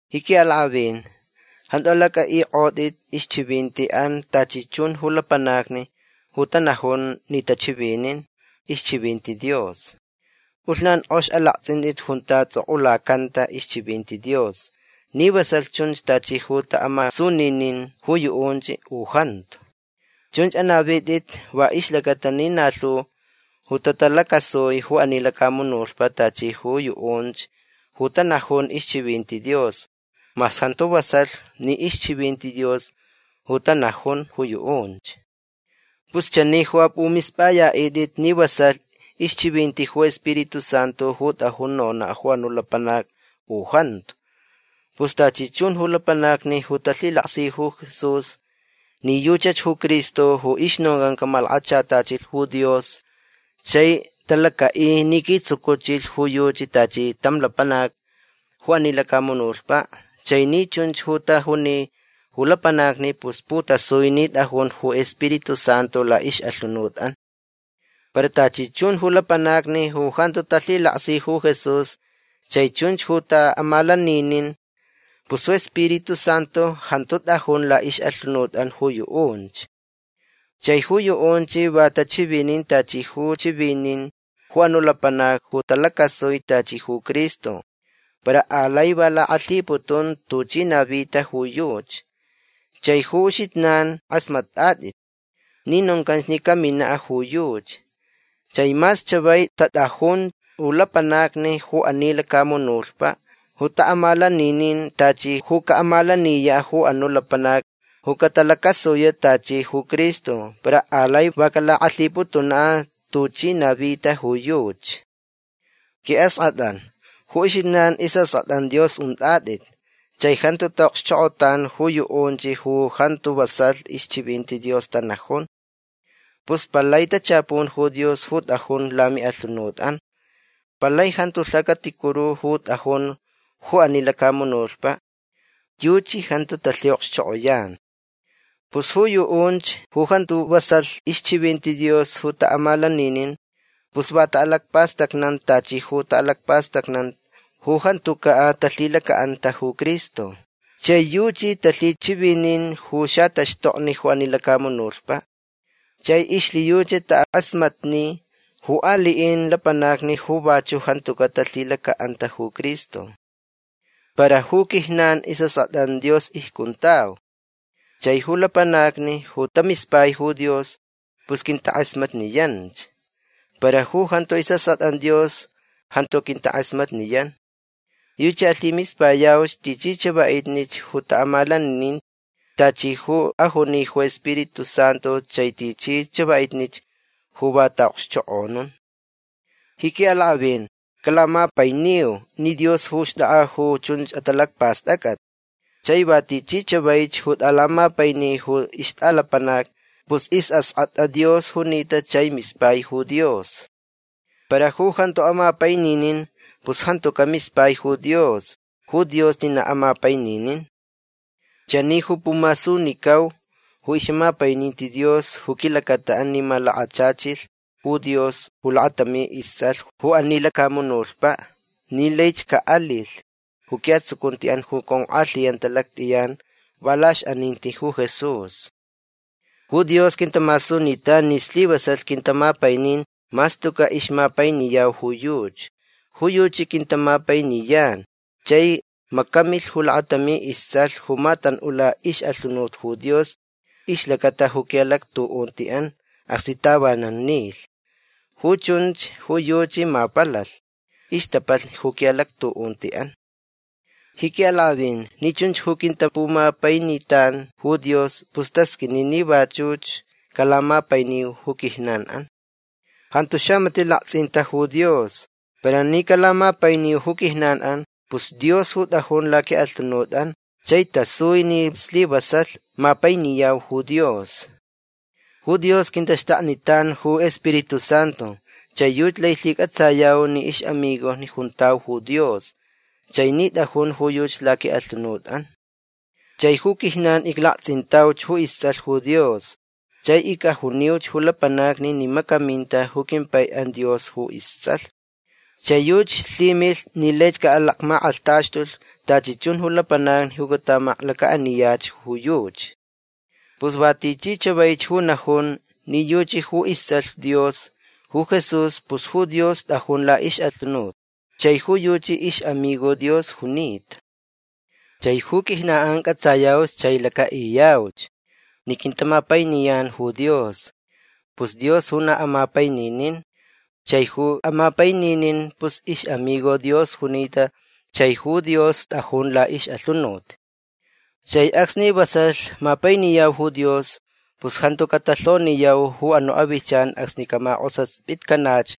Ji quiʼalakʼavin jantu alacʼaʼikʼotʼit ixchivintiʼan tachi chun ju lapanacni ju tanajun ni tachivinin ixchivinti Dios. Pʼulhnan kʼox alaktsʼintʼit junta tsʼokʼulacanta ixchivinti Dios ni vasalh chunch tachi ju taʼamasuninin ju yuʼunch u jantu. Chunch anavitʼit va ixlacata ni na lhu ju tatalacasui ju ani lacamunutpaʼ tachi ju yuʼunch ju tanajun ixchivinti Dios mas jantu vasalh ni ixchivinti Dios ju tanajun ju yuʼunch. Pus chani ju apʼumispʼayaʼitʼit ni vasalh ixchivinti ju Spiritu Santu ju tʼajun nonaʼ ju anuʼ lapanac u jantu. Pus tachi chun ju lapanacni ju talhilaksi ju Jesús ni yuchach ju Cristo ju ixnoncan camalakachatachilh ju Dios chai talacaʼi ni quitsucuchilh ju yuchi tachi tam lapanac ju ani lacamunutpaʼ chai ni chunch ju tajuni ju lapanacni pus putasui ni tʼajun ju Spiritu Santu laʼixʼalhunutʼan. Para tachi chun ju lapanacni ju jantu talhilaksi ju Jesús chai chunch ju taʼamalaninin pus ju Spiritu Santu jantu tʼajun laʼixʼalhunutʼan ju yuʼunch. Chai ju yuʼunch va tachivinin tachi ju chivinin ju anuʼ lapanac ju talacasui tachi ju Cristo para alai va lakʼalhiputun tuchi navita ju yuchi. Chai ju uxijnan kʼasmatʼatʼit ni noncan ni caminaʼ ju yuchi. Chai mas chavai tatʼajun ju lapanacni ju ani lacamunutpaʼ ju taʼamalaninin tachi ju caʼamalaniyaʼ ju anuʼ lapanac ju catalacasuyaʼ tachi ju Cristo para alai va calakʼalhiputunaʼ tuchi navita ju yuchi. Quiʼaskʼatʼan ju uxijnan isʼaskʼatʼan Dios untʼatʼit. Chai jantu taʼokxchokʼotan ju yuʼunch ju jantu vasalh ixchivinti Dios tanajun. Pus palai tachapun ju Dios ju tʼajun lamiʼalhunutʼan. Palai jantu ju lhacaticuru ju tʼajun ju ani lacamunutpaʼ. Yuchi jantu talhiʼokxchokʼoyan. Pus ju yuʼunch ju jantu vasalh ixchivinti Dios ju taʼamalaninin pus va taʼalacpastacnan tachi ju taʼalacpastacnan ju jantucaʼ talhilacaʼanta ju Cristo. Chai yuchi talhichivinin ju xataxtokni ju ani lacamunutpaʼ. Chai ixlhiyuchi takʼasmatni ju aliʼin lapanacni ju vachuʼ jantucaʼ talhilacaʼanta ju Cristo. Para ju quijnan isʼaskʼatʼan Dios icjuntau. Chai ju lapanacni ju tamispai ju Dios pus quintakʼasmatniyanch. Para ju jantu isʼaskʼatʼan Dios jantu quintakʼasmatniyan. Yuchi alhimispayauch tichi chavaʼitnich ju taʼamalaninin tachi ju ajuni ju Spiritu Santu chai tichi chavaʼitnich ju va taʼaʼokxchokʼonun. Ji quiʼalakʼavin calamapainiu ni Dios ju xtʼakʼa ju chun atalacpastʼacʼat. Chai va tichi chavaich ju tʼalamapaini ju ixtʼalapanac pus isʼaskʼatʼa Dios junita chai mispai ju Dios. Para ju jantu amapaininin pus jantucaʼ mispai ju Dios. Ju Dios ni na amapaininin. Chani ju pumasunicau ju ixʼamapaininti Dios ju quilacataʼan ni malakachachilh ju Dios ju lakatami istsʼalh ju ani lacamunutpaʼ ni laich caʼalilh ju quiʼatsucuntiʼan ju conkʼalhiyanta lactʼiyan va laʼixʼaninti ju Jesús. Ju Dios quintamasunitan ni slivasalh quintamapainin mas tucaʼ ixmapainiyau ju yuchi. Ju yuchi quintamapainiyan chai macamilh ju lakatami istsʼalh ju matanʼula ixʼalhunut ju Dios ixlacata ju quiʼalactuʼuntiʼan acsni tavanan nilh. Ju chunch ju yuchi mapalalh ixtapalh ju quiʼalactuʼuntiʼan. Ji quiʼalakʼavin ni chunch ju quintapumapainitan ju Dios pus tasqʼuini ni vachuch calamapainiu ju quijnanʼan. Jantu xamatiʼ laktsʼinta ju Dios. Para ni calamapainiu ju quijnanʼan pus Dios ju tʼajun laquiʼalhunutʼan chai tasui ni slivasalh mapainiyau ju Dios. Ju Dios quintaxtaknitan ju iSpiritu Santu. Chai yuchi lai lhicʼatsayau ni ixʼamigojni juntau ju Dios chai ni tʼajunch ju yuchi laquiʼalhunutʼan. Chai ju quijnan iclaktsʼintauch ju istsʼalh Dios chai icʼajuniuch ju lapanacni ni macaminta ju quimpaiʼan Dios ju istsʼalh. Chai yuchi lhimilh ni laich caʼalacmakʼalhtaxtulh tachi chun ju lapanacni ju catamaklacaʼaniyach ju yuchi. Pus va tichi chavaich ju najun ni yuchi ju istsʼalh Dios ju Jesús pus ju Dios tʼajun laʼixʼalhunut chai ju yuchi ixʼamigo Dios junita. Chai ju quijnanʼan cʼatsayauch chai lacaʼiyauch ni quintamapainiyan ju Dios. Pus Dios ju na amapaininin. Chai ju amapaininin pus ixʼamigo Dios junita chai ju Dios tʼajun laʼixʼalhunut. Chai acsni vasalh mapainiyau ju Dios pus jantu catalhoniyau ju anuʼ avilhchan acsni caʼamakʼosaspitcanach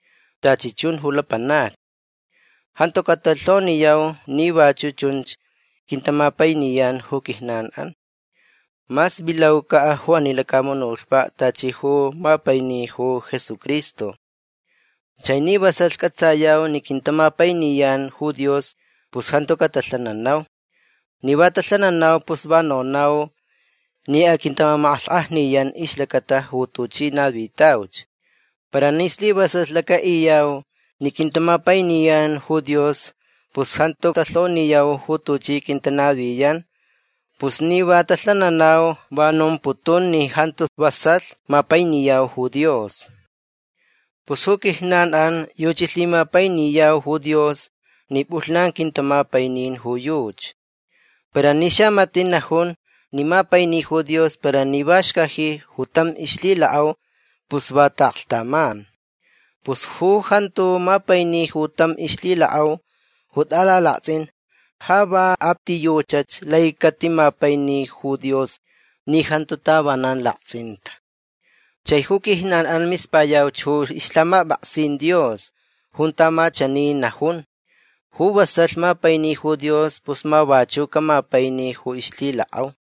tachi chun ju lapanacni. Jantu catalhoniyau ni vachuʼ chunch quintamapainiyan ju quijnanʼan mas vilaucaʼ ju ani lacamunutpaʼ tachi ju mapaini ju Jesucristo. Chai ni vasalh cʼatsayau ni quintamapainiyan ju Dios pus jantu catalhananau. Ni va talhananau pus va nonau ni aquintamamakʼalhkʼajniyan ixlacata ju tuchi navitauch. Para ni slivasalh lacaʼiyau ni quintamapainiyan ju Dios pus jantu talhoniyau ju tuchi aquintanaviyan. Pus ni va talhananau va nomputun ni jantu vasalh mapainiyau ju Dios. Pus ju quijnanʼan yuchi lhimapainiyau ju Dios ni pʼulhnan quintamapainin ju yuchi. Para ni xamatiʼ najun ni mapaini ju Dios para ni va xcaji ju tam ixlhilakʼau pus va taʼaklhtaman. Pus ju jantu mapaini ju tam ixlhilakʼau ju tʼalalaktsʼin ja va a ti yuchach lai catimapaini ju Dios ni jantu tavanan laktsʼinta. Chai ju quijnanʼan mispayauch ju ixlhamapʼaksin Dios junta ma chani najun: “Ju vasalh mapaini ju Dios pus ma vachuʼ camapaini ju ixlhilakʼau”.